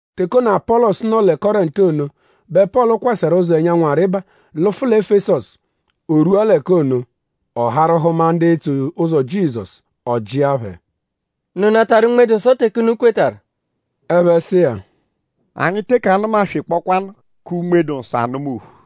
Teke ono, Apọlosu nọ lẹ Kọrentu ono bẹ Pọlu kwasẹru ụzo ẹnyanwu arịba lụfu lẹ Efesọsu. O rwua l'ẹka ono; ọ harụ hụma ndu etso ụzo Jizọsu. Ọ jịa phẹ: “?Unu natarụ Unme-dụ-Nsọ teke unu kwetarụ?” Ẹphe sụ iya: “Anyi teke anụma-swekpọkwaanu kẹ Unme-dụ-Nsọ anụma ophu.”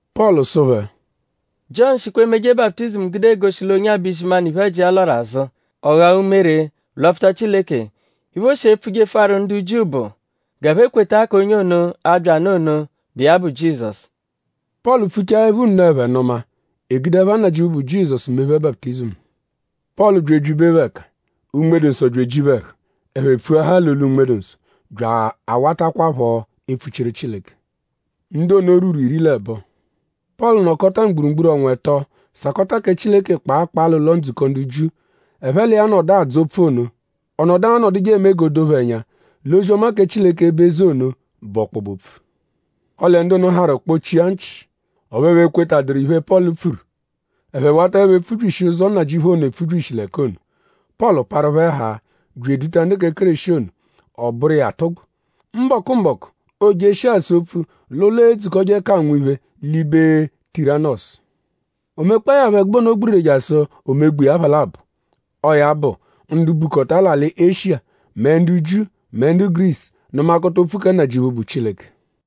Pọlu sụ phẹ: “Jiọnu shikwa emeje baputizimu gude egoshi l'onye-a bẹ izimanụ iphe-ẹji iya lwarụ azụ; ọ ghawaa umere lwapfuta Chileke. Iphe, o shi epfujefuaru ndu Jiu bụ g'ẹphe kweta k'onye ono, a-bya nụ ono, bụ iya bụ Jizọsu.” Pọlu pfuchaẹpho nno; ẹphe nụma; e gude ẹpha Nnajịuphu, bụ Jizọsu mee phẹ baputizimu. Pọlu bya ebyibe phẹ ẹka; Unme-dụ-Nsọ bya eji phẹ ẹhu. Ẹphe pfuahaa l'olu Unme-dụ-Nsọ; bya awatakwaphọ epfuchiru Chileke. Ndu ono rwuru iri l'ẹbo. Pọlu nọkota mgburugburu ọnwa ẹto sakọta kẹ Chileke kpaa kpaa l'ụlo-ndzukọ ndu Jiu. Ẹphe l'iya nọdu adzọ opfu ono. Ọ nọdu anọduje eme g'o doo phẹ ẹnya l'ozi-ọma kẹ Chileke, bụ eze ono; bụ ọkpobe-opfu. Ọle ndu ono harụ kpọchia nchị; ọphu ẹphe ekwetaduru iphe, Pọlu pfuru. Ẹphe wataẹpho epfubyishi ụzo Nnajịuphu ono epfubyishi l'ẹka ono; Pọlu parụ phẹ haa bya eduta ndu kẹ Kéreshi ono; ọ bụru iya atụgbu. Mbọku-mbọku; oojeshia asa opfu l'ụlo, eedzukọje k'anwụ iphe l'ibe Tiranọsu. O mekpọe ya phọ ẹgube ono gbiriri jasụ o megba iya apha labọ. Ọo ya bụ ndu bukọta l'alị Eshiya mẹ ndu Jiu mẹ ndu Gurisu nụmakota opfu kẹ Nnajịuphu, bụ Chileke.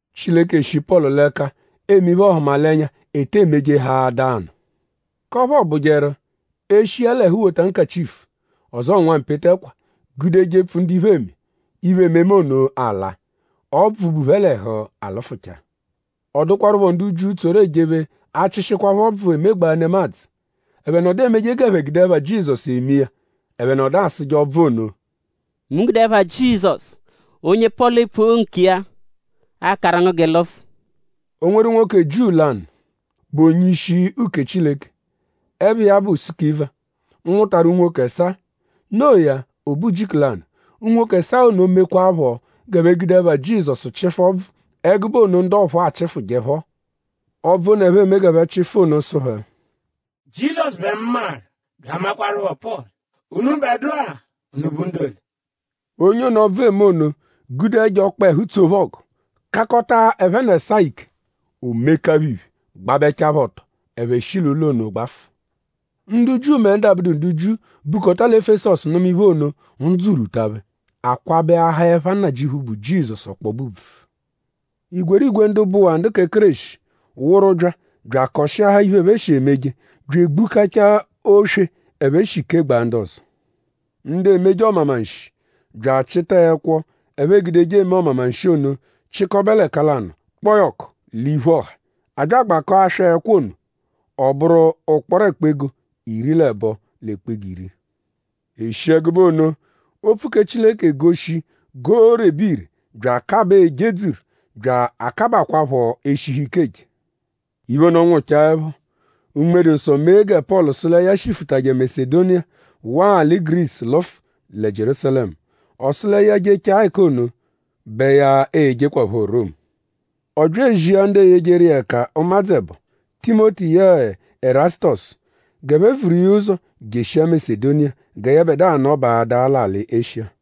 Chileke shi Pọlu l'ẹka eme iphe-ọhumalenya, ete emejehaadaa nụ; k'ọphu ọobujeru e -shi iya l'ẹhu wota nkachifu; ọzoo nwampete ẹkwa gude jepfu ndu iphe eme; iphe-ememe ono alaa; ọbvu, bu phẹ l'ẹhu alụfuchaa. Ọ dụkwarupho ndu Jiu, tsoru ejephe achịshikwapho ọbvu, emegbaa nemadzụ. Ẹphe nọdu emeje g'ẹphe gude ẹpha Jizọsu eme iya. Ẹphe nọdu asụje ọbvu ono: “Mu gude ẹpha Jizọsu, onye Pọlu epfu nkiya akaru ngu g'ị lụfu.” O nweru nwoke Jiu lanụ, bụ onye-ishi uke Chileke, ẹpha iya bụ Sukiva, nwụtaru unwoke ẹsaa. Noo ya; o be ujiku lanụ; unwoke ẹsaa ono mekwaaphọ g'ẹphe gude ẹpha Jizọsu chịfu ọbvu ẹgube ono, ndu ọphuu achịfuje phọ. Ọbvu ono, ẹphe eme g'ẹphe chịfu ono sụ phẹ: “Jizọsu bẹ mu maru bya amakwarụpho Pọlu; unubẹdua?unu bụ ndu ole?” Onye ono, ọbvu eme ono gude ẹjo ọkpehu tsoo phẹ ọgu; kakọta ẹphe n'ẹsaa ike. O meka phẹ iphe gbabẹchaa phẹ ọto. Ẹphe shi l'ụlo ono gbafụ. Ndu Jiu mẹ ndu abụdu ndu Jiu, bukọta lẹ Efesọsu nụma iphe ono; ndzụ rwuta phẹ. A kwabẹahaa ẹpha Nnajịuphu, bụ Jizọsu ọkpobe ùbvù. Igwerigwe ndu bụwaa ndu kẹ Kéreshi wụru bya bya akọshiahaa iphe, ẹphe shi emeje; bya egbukachaa oswe, ẹphe shi kegbaa ndu ọzo. Ndu emeje ọmamanshi bya achịta ẹkwo, ẹphe egudeje eme ọmamanshi ono chịkobe l'ẹka lanụ kpọo ya ọku l'iphu ọha. A bya agbakọo aswa ẹkwo ono; ọ bụru ụkporo ẹkpa-ego iri l'ẹbo l'ẹkpa-ego iri. E shi ẹgube ono; opfu kẹ Chileke goshi g'oorebe ire bya akabaa ejedzuru; bya akabakwaaphọ eshihu ike eje. Iphe ono nwụchaepho; Unme-dụ-Nsọ mee gẹ Pọlu sụ lẹ ya shifụtaje Masedoniya waa alị Gurisu lụfu lẹ Jierúsalẹmu. Ọ sụ lẹ ya -jechaa ẹka ono bẹ ya e-jekwaphọ Romu. Ọ bya ezia ndu eyejeru iya ẹka ụmadzu ẹbo; Timoti yẹe Ẹrasutosu g'ẹphe vuru iya ụzo jeshia Masedoniya gẹ yẹbedua nọbaadaa l'alị Eshiya.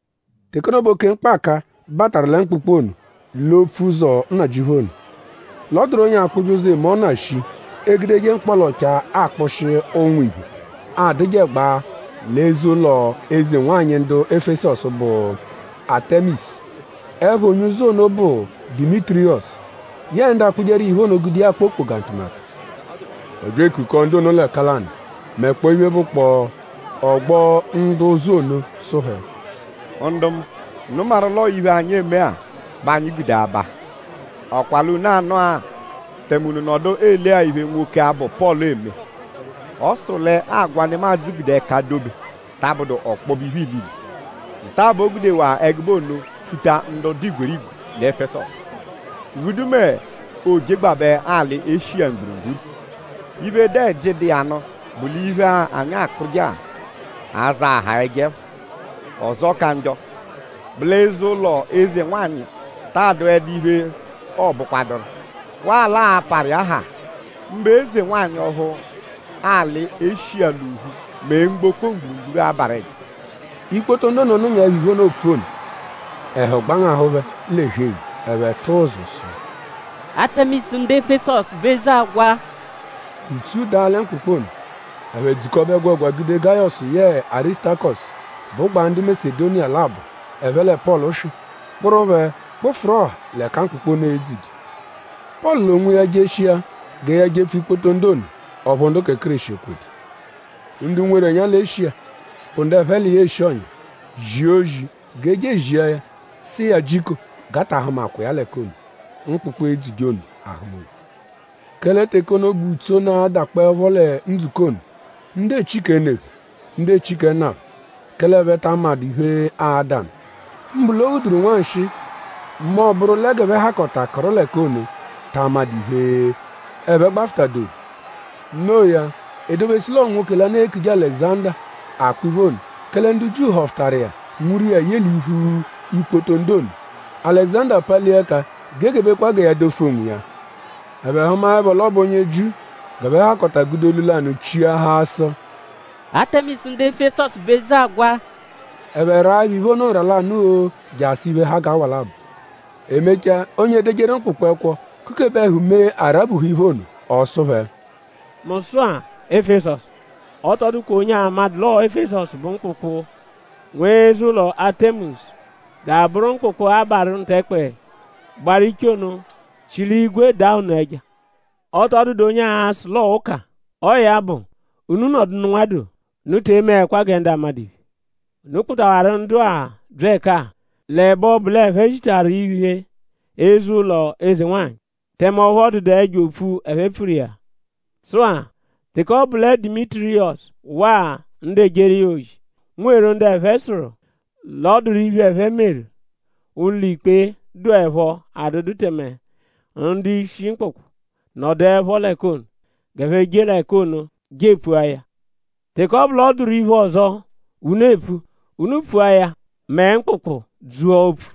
Teke ono bẹ oke mkpaka bataru lẹ mkpụkpu ono l'opfu ụzo Nnajịuphu ono. L'ọ dụru onye akpụje ụzu, eme ọna shii, egudeje mkpọla-ọchaa akpụshi ụnwu iphe, adụjegbaa l'eze-ụlo eze-nwanyị ndu Efesọsu, bụ Atẹmisu. Ẹpha onye-ụ́zú ono bụ Dimitiriyọsu. Yẹe ndu akpụjeru iya iphe ono gude iya akpa okpoga ntụmatu. Ọ bya ekukọo ndu ono l'ẹka lanụ; mẹkpoo iphe, bụkpoo ọgbo ndu ụ́zú ono sụ phẹ: “Ndu mu! Unu maru l'ọo iphe, anyi eme-a bẹ anyi gude aba. ?Ọ kwa l'unu anụ-a; tẹme unu nọdu ele-a iphe, nwoke-a, bụ Pọlu eme? Ọ sụru l'agwa, nemadzụ gude ẹka dobe ta abụdu ọkpobe iphe ilile. Nta-a bẹ o gudewaa ẹgube ono pfuta ndu dụ igwerigwe lẹ Efesọsu; ghudu mẹ oojegbabẹ alị Eshiya mgburugburu. Iphe, dụ ẹji, dụ iya nụ bụ l'iphe-a, anyi akpụje-a a-zaahaa ẹjo ẹpha. Ọzo ka njọ bụ l'eze-ụlo eze-nwanyị taa dụedu iphe, ọobukwaduru. Waa l'aa-parụ iya haa; mbụ eze-nwanyị ọphu alị Eshiya l'ophu mẹ mgboko mgburugburu abarụ ẹja.” Ikpoto ndu ono nụnyaepho iphe ono, oopfu ono; ẹhu gbangahụ phẹ l'ẹhu-eghu. Ẹphe tụ ụzu sụ: “Atẹmisu ndu Efesọsu bụ eze agwa!” Ùtsú daa lẹ mkpụkpu ono. Ẹphe dzukọbe ẹgwegwa gude Gayọsu yẹe Arisutakọsu, bụgbaa ndu Masedoniya labọ, ẹphe lẹ Pọlu swị; kpụru phẹ kpụfuru ọha l'ẹka mkpụkpu ono edzuje. Pọlu l'onwiya jeshia gẹ ya jepfu ikpoto ndu ono; ọphu ndu kẹ Kéreshi ekwedu. Ndu nweru ẹnya lẹ Eshiya, bụ ndu ẹphe l'iya eshi ọ̀nyà; zia ozi g'e je ezia ya sụ iya jiko g'a ta ahụmakwa iya l'ẹka ono, mkpụkpu edzuje ono ahụma ophu. Kẹle teke ono bẹ ùtsú ono adakpọepho lẹ ndzukọ ono. Ndu echi kẹ ne phẹ; ndu echi kẹ nna phẹ; kẹle ẹphe ta amadụ iphe, ada nụ. Mbụ l'o ghuduru nwanshịi mẹ ọ bụru lẹ g'ẹphe hakọta kụru l'ẹka ono ta amadụ iphe, ẹphe gbafụta-doru. No iya; e dobesu l'ọo nwoke lanụ, eekuje Alẹguzanda akpa iphe ono; kẹle ndu Jiu họfutaru iya nwuru iya ye l'iphu ikpoto ndu ono. Alẹguzanda palia ẹka g'e gebekwa gẹ ya dofu onwiya. Ẹphe hụmaepho l'ọ bụ onye Jiu; g'ẹphe hakọta gude olu lanụ chiahaa sụ: “Atẹmisu ndu Efesọsu bụ eze agwa!” Ẹphe raaẹpho iphe ono nra lanụ-oo jasụ iphe, ha g'awa labọ. E mechaa; onye edejeru mkpụkpu ẹkwo kukebe ẹhu mee a rabuhu iphe ono. Ọ sụ phẹ: “Mu sụ-a; Efesọsu! Ọ tọ dụkwa onye amadụ l'ọo Efesọsu bụ mkpụkpu, nwe eze-ụlo Atẹmisu bya abụru mkpụkpu, abarụ ntẹkpe, gbaru iche ono, shi l'igwe daa ono ẹja. Ọ tọ dụdu onye a-sụ l'ọo ụka. Ọo ya bụ; unu nọdunu nwadoo. Unu te emeẹkwa gẹ ndu amadụ iphe. Unu kpụtawaru ndu-a bya ẹka-a l'ẹbe ọbu l'ẹphe zitaru iphe eze-ụlo eze-nwanyị; tẹme ọphu ọ dụdu ẹjo opfu, ẹphe pfuru iya. Sụ-a; teke ọ bụ lẹ Dimitiriyọsu waa ndu ejeru iya ozi nweru ndu ẹphe sụru l'ọ dụru iphe, ẹphe meru; ụlo-ikpe dụepho adụdu tẹme ndu-ishi mkpụkpu nọduepho l'ẹka ono. G'ẹphe je l'ẹka ono je epfu iya. Teke ọ bụ l'ọ dụru iphe ọzo, unu epfu; unu epfua ya mẹ mkpụkpu dzua opfu.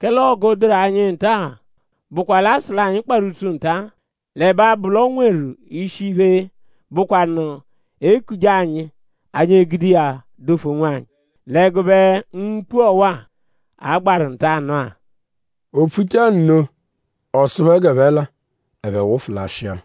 Kẹle ọgu, dụru anyi nta-a bụkwa l'aa-sụ l'anyi kparụ ùtsú ntanụ-a l'ẹbe abụ l'o nweru ishi iphe, bụkwanu e -kuje anyi; anyi egude iya dofu onwanyi l'ẹgube mkpu ọwa-a, a gbaru ntanụ-a.” O pfuchaa nno; ọ sụ phẹ g'ẹphe la. Ẹphe wụfu lashịa.